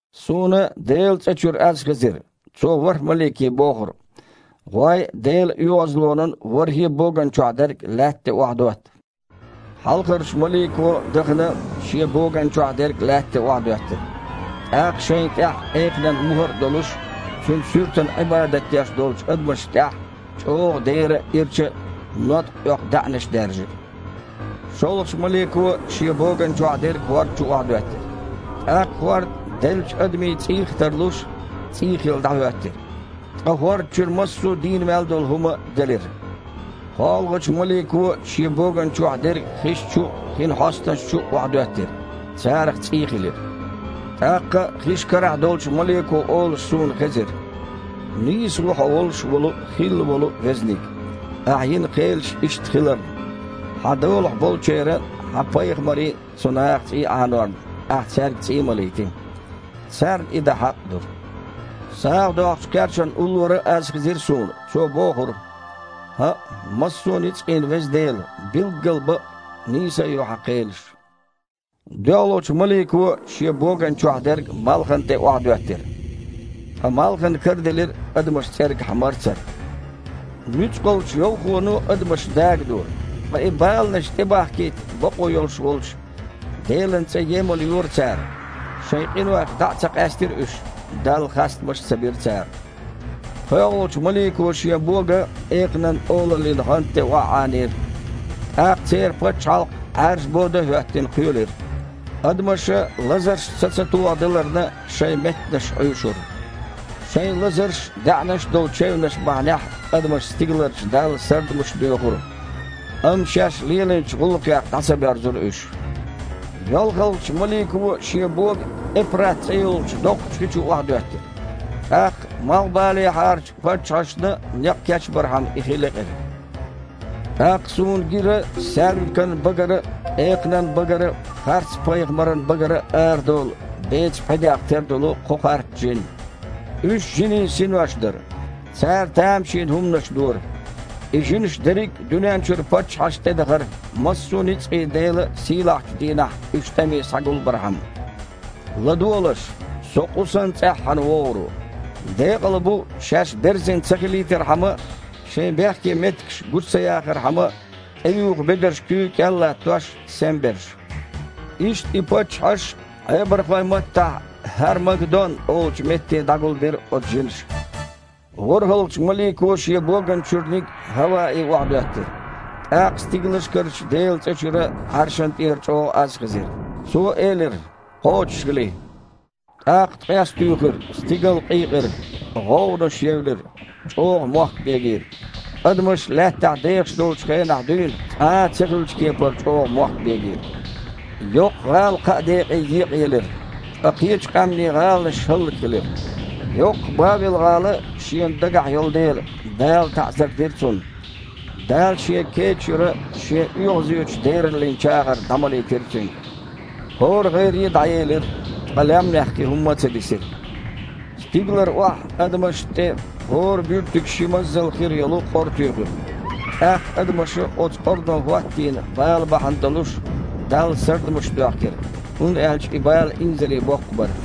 Суна Делан цІа чуьра аз хезира. Цо ворхІ малике бохура: «ГІой, Делан оьгІазлонан ворхІе а боган чохь дерг лаьтта тІе охьадотта». Хьалхарчу малико, дахана, шен боган чохь дерг лаьтта тІе охьадоьттира. ТІаккха шайна тІехь экханан мухІар а долуш, цуьнан суьртана Іибадат деш долчу адамашна тІехь чІогІа дера а, ирча а ноткъа оьху даьІнаш даьржира. ШолгІачу малико шен боган чохь дерг хІорда чу охьадоьттира. ТІаккха хІорд, деллачу адамийн цІийх а тарлуш, цІий хилла дІахІоьттира. Ткъа хІорда чуьра массо а дийна мел долу хІума делира. КхоалгІачу малико шен боган чохь дерг хиш чу а, хин хьостанаш чу а охьадоьттира. Царах цІий хилира. ТІаккха хиш карахь долчу малико олуш суна хезира: «Нийса ву Хьо волуш волу а, хилла волу а Везаниг, Ахь йина кхелаш иштта хиларна. Хьан долахь болчеран а, Хьан пайхамарийн а цу наха цІий Іанорна, Ахь цаьрга цІий малийти. Царна и дан хьакъ а ду». СагІа доккхучу кхерчана уллора а аз хезира суна. Цо бохура: «ХІаъ, массо а ницкъийн Веза Дела, билггал бакъ а, нийса а ю Хьан кхелаш». ДоьалгІачу малико шен боган чохь дерг малхана тІе охьадоьттира. Ткъа малхан караделира адамаш цІергахь марцар. Нуьцкъалчу йовхоно адамаш дагадора. Ткъа и баланаш тІебахкийта бакъо йолуш волчу Делан цІе емалйора цара. Шайн къинойх дІа а ца къаьстира уьш, Далла хастамаш а ца бира цара. ПхоьалгІачу малико шен бога экханан олаллин гІанта тІе охьаІанийра. ТІаккха церан пачхьалкх, Іаьржа бода а хІоьттина, кхоьлира. Адамаша, лазаршна са ца тохадаларна, шайн меттанаш Іуьйшура. Шайн лазарш а, даьІнаш долу чевнаш а бахьанехь адамаша стигаларчу Далла сардамаш доьхура. Амма шаьш лелийначу гІуллакхех дІа ца боьрзура уьш. ЙолхалгІачу малико шен бога Эпрат цІе йолчу доккхачу хи чу охьадоьттира. ТІаккха, малхбалехьарчу паччахьашна некъ кечбархьама, и хи лекъира. ТІаккха суна гира саьрмикан багара а, экханан багара а, харцпайхамаран багара а арадолу, бецан пхьидех тера долу кхо харц жин. Уьш жинийн синош дара. Цара тамашийна хІуманаш дора. И жинаш дерриг а дуьнен чуьра паччахьашна тІе дахара, массо а ницкъийн Делан сийлахьчу дийнахь уьш тІаме схьагулбархьама. «ЛадогІалаш! Со, къу санна, цІеххьана вогІур ву. Декъала бу, шаьш берзина ца хилийтархьама а, шайн бехке меттигаш гучу ца яхархьама а, тІеюху бедарш куьйга кІел а латтош, сема берш». Иштта, и паччахьаш Іебархойн маттахь ХІар-Магдон олучу метте дІагулбира оцу жинаша. ВорхІалгІачу малико шен боганна чуьрниг хІаваэ охьадоьттира. ТІаккха стигалшкарчу Делан цІа чуьра Іаршана тІера чІогІа аз хезира. Цо элира: «Кхочушхили!» ТІаккха ткъес туьйхира, стигал къийкъира, гІовгІанаш евлира, чІогІа мохк бегийра. Адамаш лаьттахь дехаш долчу хенахь дуьйна, цкъа а ца хиллачу кепара чІогІа мохк бегийра. Йоккха гІала кхаа декъе екъаелира. Ткъа кхечу къаьмнийн гІаланаш хІаллакьхилира. Йоккха Бавел-гІала Шена дагахь йолу дела, Дала таІзар дира цунна. Дала Шен кеда чуьра Шен оьгІазечу дераллин чагІар дІамалийтира цуьнга. ХІора гІайре а дІаелира, ткъа лаьмнех кхин хІумма а ца дисира. Стигалара охьа адамашна тІе хІора буьртиг ши мазал хир йолу къора туьйхира. ТІаккха адамаша оцу къорано хІоттийна бала бахьана долуш Далла сардамаш доьхкира, хІунда аьлча и бала инзаре боккха бара.